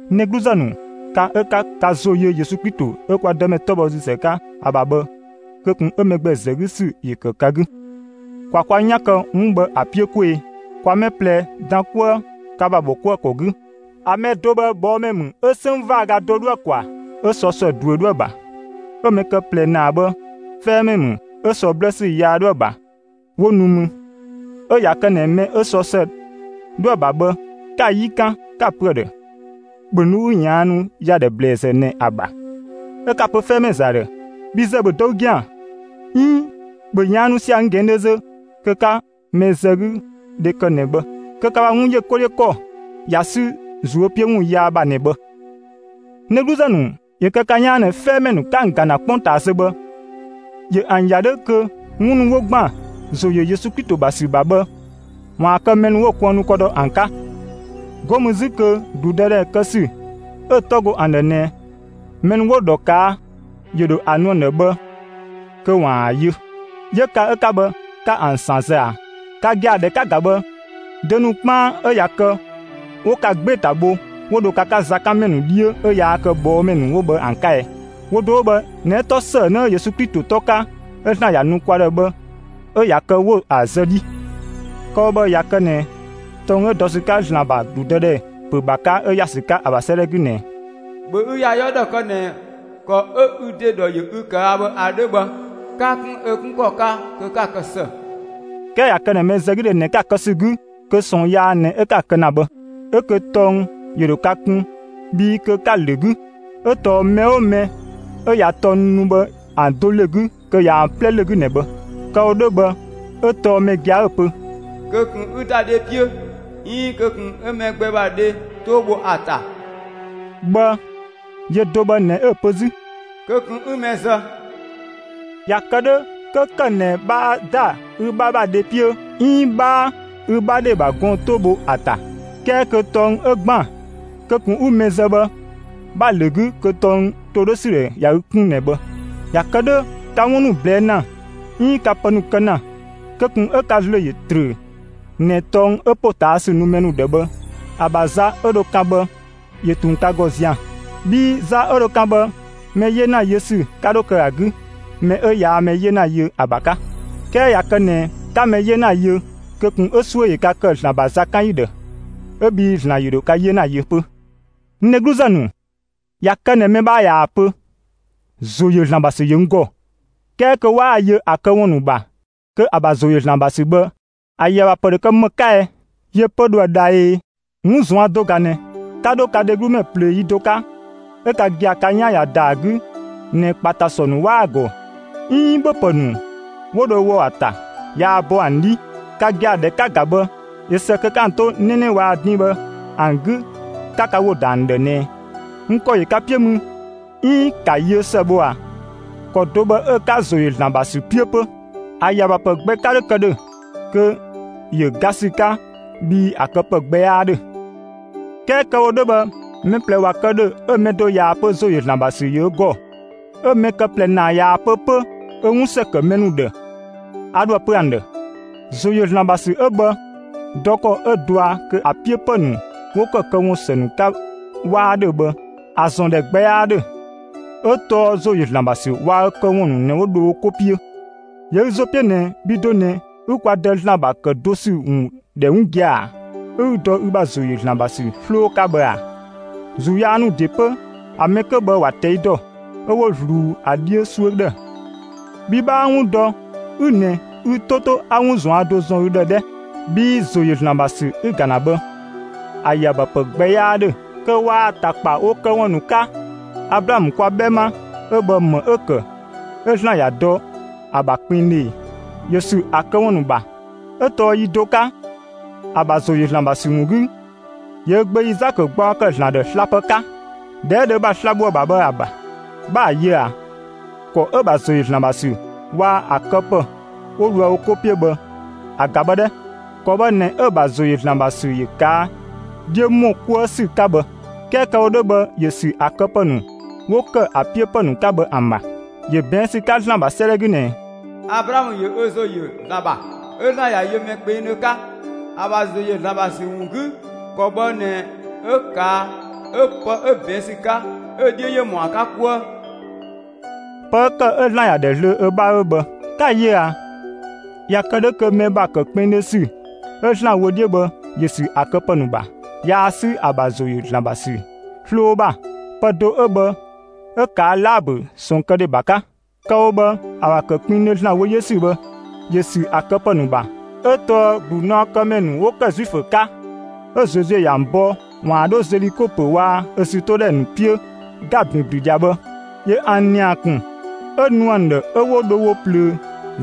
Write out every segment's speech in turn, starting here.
N dhegluzë ‑nu, ka 'ö 'ka ka ‑zo yö Yesu Klito 'ö kwa Dëmɛ 'tɔbhɔsüzë 'ka ‑a ‑bha bhë, kö ꞊kun 'ö mɛ gbɛ ‑zë 'gü kë ‑sü ‑yö ‑kë ka 'gü. ‑Kwa kwa 'yan kë 'wun bhë ‑a 'piö 'kwee‑! ‑Kwa mɛ ꞊plɛ dan 'kuë ka ‑bha ‑bhɔkuëkɔ 'gü. ‑A mɛ do bhë ꞊bhɔɔmɛ ‑mü 'ö 'sënng ‑vaaga do 'dhoë‑ ‑kwaa; 'ö sɔ ‑së ꞊duö 'dhoë‑ ‑bha; 'ö‑ mɛ kë ꞊plɛ ‑naa bhë, 'fɛɛmɛ ‑mü 'ö sɔ 'blësü yaa 'dhoë‑ ‑bha, 'wo nu mü. 'Ö ꞊ya kë ꞊nɛ mɛ 'ö sɔ ‑së 'dhoë‑ ‑bha bhë, 'ka‑ 'yi 'kan, 'ka‑ pö ‑a ‑dhë: «‑Bhö nu 'ü ꞊yaannu ‑yadhɛ ꞊bhlëzë ꞊nɛ ‑a ‑bha!» 'Ö 'ka‑ pö 'fɛɛmɛ ‑zë ‑dhë: «Bhi ‑zë, ‑bhö dɔ ü ‑gɛan!» 'iin: «‑Bhö ꞊yaannu sia‑ n ꞊gɛɛndhö zö!» kö 'ka mɛzëgüdhe kë ꞊nɛ bhë, kö ka ‑bha 'wun ‑yö 'ko 'dhiö ‑kɔ ꞊ya 'sü ꞊zuö' 'piö ‑wun yaa ‑bha ꞊nɛ bhë. N dhegluzë ‑nu, ‑yö kë ka 'yaan ꞊nɛ 'fɛɛmɛ ‑nu 'ka ‑an ‑ga ‑na 'kpongtaa zö bhë, ‑yö ‑an ‑ya 'dhö kö 'wun ‑nu 'wo ‑gban ‑zo ‑yö Yesu Klito ‑bha ‑sü ‑bha bhë, ‑waan kë mɛ ‑nu 'wo‑ kuënnu ‑kɔ dɔ ‑an 'ka, 'go mü 'zü kö ‑gludëdhɛ kë ‑sü 'ö‑ 'tɔ go ‑an ‑dhë ꞊nɛ mɛ ‑nu 'wo‑ ‑dhɔ ꞊kaa', ‑yö ‑dho ‑a nu ‑an ‑dhë bhë kö ‑waan ‑a yö. 'Yö ka 'ö 'ka bhë, 'ka ‑an ‑san zë ꞊a? Ka gia‑, ‑dhɛ 'ka‑ ‑ga bhë, dö ‑nu 'kpaan 'ö ꞊ya kë 'wo ka 'gbee‑ ‑ta bho, 'wo dho ka 'ka zakanmɛ ‑nu 'dhiö 'ö yaa kë ꞊bhɔɔmɛ ‑nu 'wo bhë ‑an 'ka ɛɛ? Wo do 'wo bhë ꞊nɛ 'ö 'tɔ ‑sëënë 'ö Yesu Klito ‑tɔ 'ka, 'ö ‑Zlan ‑ya nu kwa ‑dhë bhë 'ö ꞊ya kë 'wo‑ zë 'dhii. Kë‑ wo bhë, ꞊ya kë ꞊nɛ tɔng 'ö dɔ ‑sü 'ka ‑Zlan ‑bha ‑gludëdhɛ ‑pö ‑bha 'ka, 'ö ‑ya ‑sü 'ka ‑a ‑bha 'sëëdhɛ 'gü ꞊nɛ: ‑Bhö ü ‑ya 'yɔɔ ‑dhɔ kë ꞊nɛ ‑kɔ 'ö ü ‑de ‑dhɔ ‑yö ü ꞊kaa' bhë ‑a 'dhö bhë, 'ka‑ 'kun ö 'kun ‑kɔ 'ka kö ka‑ ‑kë ‑së. 'Kɛɛ ꞊ya kë ꞊nɛ mɛzëgüdhe ꞊nɛ 'ka‑ kë ‑sü 'gü, kö ꞊sɔɔn yaa ꞊nɛ 'ö 'ka‑ kë ‑na bhë; 'ö kö tɔng ‑yö ‑dho ka kun, bhii kö 'ka‑ ‑lö 'gü. 'Ö tɔɔ mɛ 'oo mɛ 'ö ꞊ya tɔng ‑nu 'wo bhë ‑an do ‑lö 'gü kö ꞊ya ‑an 'plɛ ‑lö 'gü ꞊nɛ bhë. Kë‑ wo 'dhö bhë 'ö tɔɔ mɛ gia‑ 'ö‑ pö: «Kö ꞊kun 'ü ‑da dhe 'piö 'iin kö ꞊kun 'ü mɛ gbɛ ‑bha dhe 'too bho ‑a ‑ta» bhë, yö do bhë ꞊nɛ 'ö‑ pö 'zü: «Kö ꞊kun 'ü mɛ zë». ꞊Ya kë 'dhö, 'kö ‑kë ꞊nɛ 'bhaa ‑da ü 'bha ‑bha dhe 'piö 'iin 'bhaa ü 'bha dhe ‑bha gɔɔn‑ 'too bho ‑a ‑ta, 'kɛɛ kö tɔng 'ö ‑gban «kö ꞊kun 'ü mɛ zë» ‑bha bhë, 'bha‑ ‑lö 'gü, kö tɔng ‑to 'dhö ‑sü ꞊ya ü 'kun ꞊nɛ bhë. ꞊Ya kë 'dhö, ka 'wun ‑nu ꞊blɛɛ' ‑na 'iin ka pë ‑nu kë ‑na, kö ꞊kun 'ö ka ‑zlö ‑yö ‑trö ꞊nɛ tɔng 'ö ‑potaasü nu mɛ ‑nu ‑dhë bhë ‑a ‑bha za 'ö dho kan bhë ‑yö ꞊tun ka ‑gɔ zian‑; bhii za 'ö dho kan bhë, mɛ 'yena yö ‑sü 'ka 'dho kë ‑a 'gü mɛ 'ö yaa mɛ 'yena yö ‑a ‑bha 'ka. 'Kɛɛ ꞊ya kë ꞊nɛ 'ka mɛ ‑nu 'yena yö, kö ꞊kun 'ö 'suö ‑yö ka kë ‑Zlan ‑bha zakanyi ‑dhë, 'ö bhii ‑Zlan ‑yö ‑dho ka 'yena yö 'pö. N dhegluzë ‑nu, ꞊ya kë ꞊nɛ mɛ ꞊yaa‑ pö: «‑Zo ‑yö ‑Zlan ‑bha ‑sü ‑yö n ‑gɔ», 'kɛɛ kö 'waa‑ yö ‑a këwun ‑nu ‑bha kö ‑a ‑bha ‑zo ‑yö ‑Zlan ‑bha ‑sü bhë ‑a ‑yö ‑a ‑bha ‑pë ‑dho kë ‑më 'ka ɛɛ? Yö 'pö dhoë‑ dha ꞊ee? 'Wun ꞊zuan' do ꞊ga ꞊nɛ: 'Ka dho ka dheglumɛ ꞊plöö yi do 'ka, 'ö ka gia‑ ka 'yan ꞊ya ‑da ‑a 'gü ꞊nɛ ‑kpatasɔ ‑nu 'waa ‑an ‑gɔ 'iin ‑bhöpë ‑nu 'wo dho wɔ ‑a ‑ta yaa bɔ ‑an 'dhi, ka gia‑, ‑dhɛ 'ka‑ ‑ga bhë ꞊yö ‑së kö 'ka ‑an 'to 'nɛnɛ waa‑ din bhë ‑an 'gü 'ka ka ‑wo ‑da ‑an ‑dhë ꞊nɛ: «N ‑kɔ ‑yö ka 'piö mü», 'iin: «‑Ka yiö ‑së bho» ꞊a? ‑Kɔ do bhë 'ö‑ 'ka ‑zo ‑yö ‑Zlan ‑bha ‑sü 'piö 'pö. ‑A ‑yö ‑a ‑bha ‑pë gbɛ 'ka 'dho kë ‑dhö; kö ‑yö ga ‑sü 'ka, bhii ‑a këpë gbɛ 'yaa 'dhö. 'Kɛɛ kë‑ wo 'dhö bhë, mɛ ꞊plɛ ꞊wa kë ‑dhö 'ö‑ mɛ do ꞊yaa‑ pö ‑zo ‑yö ‑Zlan ‑bha ‑sü ‑yö ö ‑gɔ, 'ö‑ mɛ kë ꞊plɛ ‑naa ꞊yaa‑ pö 'pö ö 'wun ‑së ‑kë mɛ ‑nu ‑dhë, a dhoë‑ pö ‑an ‑dhë: ‑Zo ‑yö ‑Zlan ‑bha ‑sü 'ö bhë, dɔ ‑kɔ 'ö dɔa kö ‑a 'piö ‑pë ‑nu 'wo ‑kë këwun ‑së ‑nu 'ka 'waa 'dhö bhë, ‑a ‑zɔn ‑dhɛ gbɛ 'yaa ‑dhö; 'ö tɔɔ ‑zo ‑yö ‑Zlan ‑bha ‑sü waa‑ ö këwun ‑nu ꞊nɛ 'ö 'wo dho wo 'ko 'piö. ‑Yö ü ‑zo 'piö ꞊nɛ bhi do ꞊nɛ 'ü (kwa Dë) ‑Zlan ‑bha ‑kë do ‑sü ‑wun ‑dhɛ 'wun gia‑, 'ö 'ü dɔ ü ‑bha ‑zo ‑yö ‑Zlan ‑bha ‑sü 'sloo 'ka bhë ꞊a? ‑Zuu yaa ‑nu ‑de 'pö, ‑a mɛ 'kö bhë ‑wa ꞊tɛi' ‑dɔ, 'ö 'wo ꞊zluun ‑a 'dhiö 'suö ‑dhë. Bhi 'bhaa 'wun dɔ 'ü ꞊nɛ, ü 'to 'to 'a 'wun ꞊zuan' do ‑zɔn ü ‑dhë 'dhɛ, bhii ‑zo ‑yö ‑Zlan ‑bha ‑sü 'ü‑ ‑ga ‑na bhë, ‑a ‑yö ‑a ‑bha ‑pë gbɛ 'yaa 'dhö kö waa‑ ‑ta ‑kpa wo këwun ‑nu 'ka. Ablaamö kwa 'bhɛma 'ö bhë, ‑më 'ö‑ ‑kë 'ö ‑Zlan ‑ya dɔ ‑a ‑bha kpengdhö ꞊e? ‑Yö ‑sü ‑a këwun ‑nu ‑bha, 'ö tɔɔ yi do 'ka (‑a ‑bha ‑zo ‑yö ‑Zlan ‑bha ‑sü ‑wun 'gü), ‑yö ö gbö Izaakö gbaɔ ‑kë ‑Zlan ‑dhë slapë 'ka, ‑dhɛ 'ö dho ö ‑bha sla‑ bho ‑a ‑bha bhë ‑a ‑bha. 'Bha‑ yö ꞊a? ‑Kɔ 'ö‑ ‑bha ‑zo ‑yö ‑Zlan ‑bha ‑sü waa‑ ‑a këpë 'wo dhoë wo 'ko 'piö bhë ‑a ‑ga bhë 'dhɛ! ‑Kɔ bhë ꞊nɛ 'ö‑ ‑bha ‑zo ‑yö ‑Zlan ‑bha ‑sü ‑yö ꞊kaa' 'dhiö ‑mɔ 'kuë ‑sü 'ka bhë; 'kɛɛ kë‑ wo 'dhö bhë ‑yö ‑sü ‑a këpë ‑nu 'wo ‑kë ‑a 'piö ‑pë ‑nu 'ka bhë ‑an ‑bha. ‑Yö ꞊bɛɛn' ‑sü 'ka ‑Zlan ‑bha 'sëëdhɛ 'gü ꞊nɛ: Ablaamö ‑yö ö ‑zo ‑yö ‑Zlan ‑bha, 'ö ‑Zlan ‑ya yö mɛ kpengdhö 'ka, ‑a ‑bha ‑zo ‑yö ‑Zlan ‑bha ‑sü ‑wun 'gü. ‑Kɔ bhë ꞊nɛ 'ö ꞊kaa' 'ö pë 'ö ꞊bɛɛn' ‑sü 'ka 'ö‑ 'dhiö ‑yö ‑mɔ ‑a 'ka 'kuë. Pë 'ö ‑kë 'ö ‑Zlan ‑ya ‑dhɛ zlöö ö 'bha 'ö bhë. Ka‑ ‑yö ꞊a; ꞊ya kë 'dhö kö mɛ ‑bha ‑kë kpengdhö ‑sü 'ö ‑Zlan wö 'dhiö bhë ‑yö ‑sü ‑a këpë ‑nu ‑bha; yaa 'sü ‑a ‑bha ‑zo ‑yö ‑Zlan ‑bha ‑sü 'sloo ‑bha. Pë do bhë 'ö ꞊kaa' Laabö, ꞊sɔɔnkëdhe ‑bha 'ka. Kë‑ wo bhë, ‑a ‑bha ‑kë kpengdhö ‑Zlan wö 'dhiö ‑sü bhë, ‑yö ‑sü ‑a këpë ‑nu ‑bha; 'ö tɔɔ ‑glunaɔkëmɛ ‑nu 'wo ‑kë Zuifö 'ka ('ö Zozue ‑yö ‑an bɔ ‑waan 'dho Zeliko ‑pö waa‑ ö ‑zütodhɛ ‑nu 'piö, ‑ga ‑binblü ꞊dhia) bhë, ‑yö ‑an ‑nia ‑kun 'ö nu ‑an ‑dhë 'ö 'wo dho wo ꞊plöö,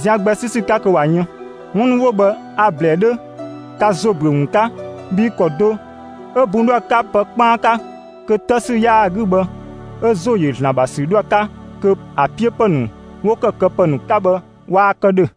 zian gbɛ 'sü ‑sü 'ka kö ꞊wa yën. ('Wun ‑nu 'wo bhë, a‑ ‑blɛɛ 'dhö ka ‑zo ‑büö ‑wun 'ka,) bhii ‑kɔ do 'ö bun 'dhoë‑ 'ka pë 'kpaan 'ka kö 'të ‑sü 'yaa‑ ‑gɔ bhë 'ö ‑zo ‑yö ‑Zlan ‑bha ‑sü 'dhoë‑ 'ka, kö ‑a 'piö ‑pë ‑nu 'wo ‑kë këpë ‑nu 'ka bhë, waa kë ‑dhö.